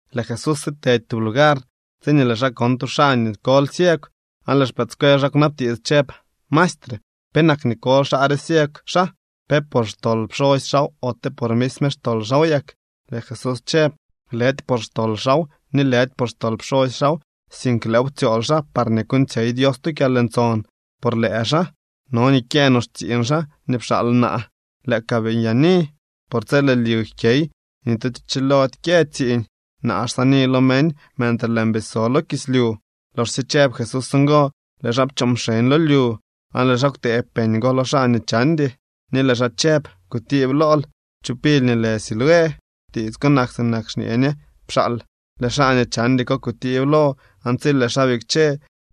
Lëë Jesús sitedy tub lugar, tsiñee lëë xaa kon tu xaa nii koly ciegw. Aan lëë xpëëdscuel xaa kwnabtiits chëb: —Maestre, ¿penak nii koly xaa re ciegw xaa? ¿Pe por xtol pxosy xaaw ote por misme xtol xaaw yak? Lëë Jesús chëb: —Lëdy por xtol xaaw, ni lëdy por xtol pxosy xaaw, sink lëëw ptsyool xaa parñee kuuñtsyey Dios tu kyalntson por lëë xaa. No nii kyëë no xtsiiñ xaa nii pxaal naa lëë ka bii nyaani. Por tsi lëë lyu jkyey, ni tu cho chilody kyë tsiiñ. Naa xsaani lo meñ mentre lëën bii so lo kislyu. Loxsye chëb Jesús ngo, lëë xaa pchoo mxeñ lo lyu, aan lëë xaa kwtëëb peñ go lo xaa nii chandy, ni lëë xaa chëb: —Kutiib lool chu pily nii lë Siloé. (Tiits ko nak sinak nii xñee ñe: Pxaal.) Lëë xaa nii chandy ko kutiib lo aan tsi lëë xaa bikche,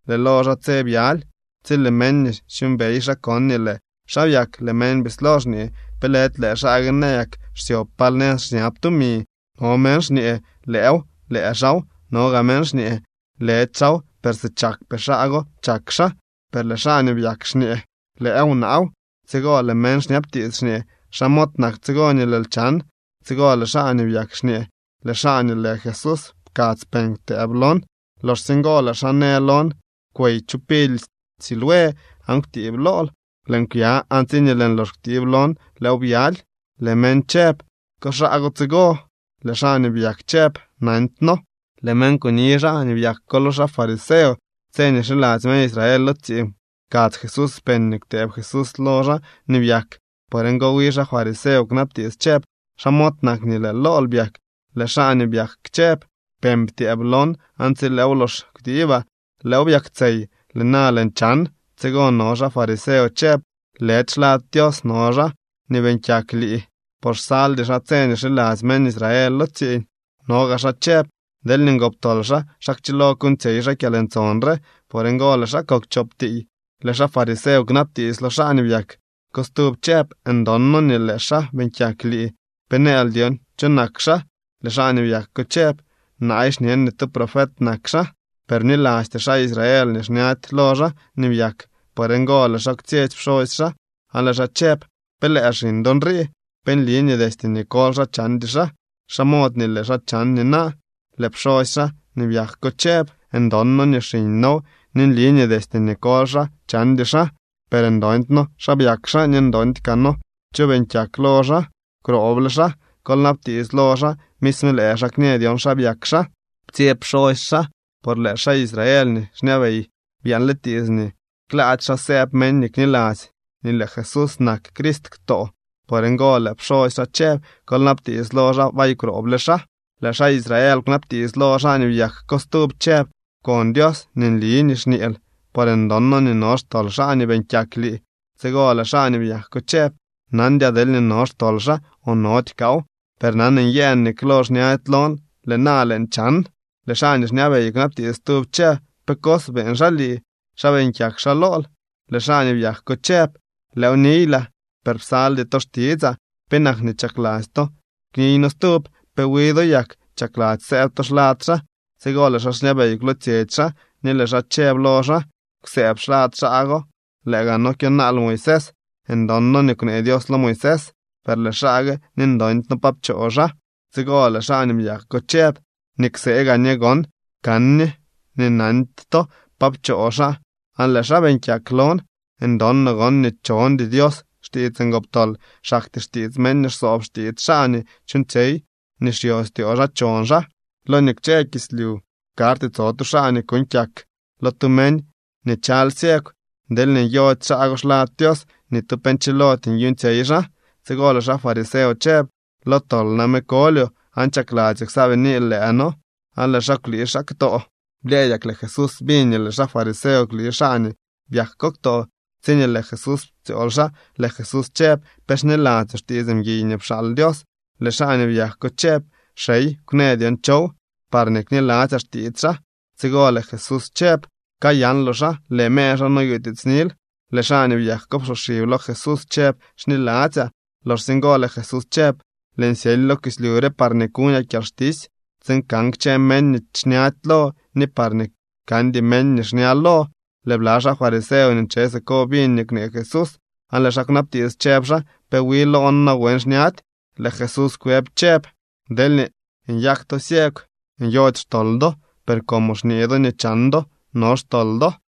lëë lo xaa tse byaly. Tsi lëë meñ nii xyuumbey xaa kon nii lëë xaa byak, lëë meñ bislo xñee: —¿Pe lëdy lëë xaa gue nayak xsyob pal nëz xñab tumi? No meñ xñee: —Lëëw, lëë xaaw. No gaa meñ xñee: —Lëdy xaaw, per si chakpee xaa go chak xaa. Per lëë xaa nii byak xñee: —Lëëw, naaw. Tsigo lëë meñ xñabtiits xñee: —¿Xa mod nak tsigo nii lëël chan? Tsigo lëë xaa nii byak xñee: —Lëë xaa nii lë Jesús pkadz peñ kwtëëb lon. Loxsye ngo lëë xaa në lon: “Kwey chu pily Siloé aan kwtiib lool.” Lëën kwya, aan tsiñee lëën lox kwtiib lon, lëëw byaly. Lëë meñ chëb: —¿Ko xaa go tsigo? Lëë xaa nii byak chëb: —Nandyno. Lëë meñ kuni xaa nii byak lo xaa fariseo. Tse nii xiladzy meñ Israel lo tsiiñ pkadz Jesús peñ nii kwtëëb Jesús lo xaa nii byak. Por ngo, wi xaa fariseo kwnabtiits chëb: —¿Xa mod nak nii lëë lool byak? Lëë xaa nii byak chëb: —Peñ ptyëëb lon, aan tsi lëëw lox kwtiibaa, lëëw byaktsey. Lëë na lëën chan. Tsigo no xaa fariseo chëb: —Lëdy xlad Dios no xaa nii beeñ kyak lii, por xsaldy xaa tse nii xiladzy meñ Israel lo tsiiñ. No gaa xaa chëb: —Deelñee ngoptol xaa, ¿xa kchilo kuuñtsyey xaa kyalntson re? Por ngo lëë xaa kok chop tiiy. Lëë xaa fariseo kwnabtiits lo xaa nii byak ko stub chëb: —Ndon noo nii lëë xaa beeñ kyak lii. ¿Pe nëël dyon cho nak xaa? Lëë xaa nii byak ko chëb: —Naay xñen nii tu profet nak xaa. Per bnilasty xaa Israel nii xñady lo xaa nii byak. Por ngo lëë xaa kwtsyetsy pxosy xaa aan lëë xaa chëb: —¿Pe lëë xiñ do nrii? ¿Pe nli nii destye nii koly xaa chandy xaa? ¿Xa mod nii lëë xaa chan nina? Lëë pxosy xaa nii byak ko chëb: —Ndon noo nii xiñ noow, ni nli nii destye nii koly xaa chandy xaa. Per ndondy noo xa byak xaa, ni ndondy kaa noo cho beeñ kyak lo xaa. Kwrooble xaa, kol nabtiits lo xaa. Misme lëë xaa kñë dyon xa byak xaa. Ptsyeb pxosy xaa, por lëë xaa Israel nii xñabey byaanle tiits nii klaady xaa sëëb meñ nii kniladzy nii lëë Jesús nak Crist ktoo. Por ngo lëë pxosy xaa chëb: “Kol nabtiits lo xaa. Bay kwrooble xaa.” Lëë xaa Israel kwnabtiits lo xaa nii byak ko stub chëb: —Pkon Dios nii nli nii xñeel, por ndon noo nii no xtol xaa nii beeñ kyak lii. Tsigo lëë xaa nii byak ko chëb: —Nandyaa deelñee no xtol xaa o nody kaaw, per nan nyëën nii klo xñady lon, lëë na lëën chan. Lëë xaa nii xñabey kwnabtiits stub chëb: —¿Pe cos beeñ xaa lii? ¿Xa beeñ kyak xaa lool? Lëë xaa nii byak ko chëb: —Lëëw niylaa, per psaldy to xtitsaa. ¿Penak nii chakladzy to kniyno stub? ¿Pe wi do yak chakladzy sëëb to xlad xaa? Tsigo lëë xaa xñabey kwlootsyetsy xaa, ni lëë xaa chëb lo xaa: —Kwsëëb xlad xaa go, lëë gaa noo kyonaal Moisés. Ndon noo nii kwnee Dios lo Moisés. Per lëë xaa gue, ni ndondy noo pa pchoo xaa. Tsigo lëë xaa nii byak ko chëb: —Nii ksee gaa ñe gon kan ñe nii nandy to pa pchoo xaa, aan lëë xaa beeñ kyak lon. Ndon no gon nii chondy Dios xtiits ngoptol. Xaktyee xtiits meñ nii xsoob xtiits xaa nii chuuñtsyey nii xyostyoo xaa chon xaa. Lo nii kwche kislyu karty tso tu xaa nii kuuñ kyak lo tu meñ nii chaly ciegw. Deelñee nyody xaa go xlad Dios, ni tu pe nchilody nyuuñtsyey xaa. Tsigo lëë xaa fariseo chëb: —Lo tol name kolyoo aan ¿chakladzyoo ksaabiniil lëë noo? Aan lëë xaa kwlii xaa ktoo. Blyëëdyak lëë Jesús biñ nii lëë xaa fariseo kwlii xaa nii byak ko ktoo. Tsiñee lëë Jesús ptsyool xaa, lëë Jesús chëb: —¿Pe xniladzyoo xtiits mguiy nii pxaal Dios? Lëë xaa nii byak ko chëb: —Xey, kwnë dyon chow, parñee kniladzyaa xtiits xaa. Tsigo lëë Jesús chëb: —Kayanloo xaa. Lëë mer xaa noyutiitsnil. Lëë xaa nii byak ko psoxib lo Jesús chëb: —Xniladzyaa. Loxsye ngo lëë Jesús chëb: —Lëën syely lo kislyu re parñee kuñaa kyalxtisy tsiin kan kchë meñ nii xñady lo ni parñee kandy meñ nii xña lo. Lëë bla xaa fariseo nii nche siko biñ nii kwnee Jesús aan lëë xaa kwnabtiits, chëb xaa: —¿Pe wi loo noo nawen xñady? Lëë Jesús kwëb chëb: —Deelñee nyak to ciegw, nyody xtol do. Per como xñee do nii chan do, no xtol do.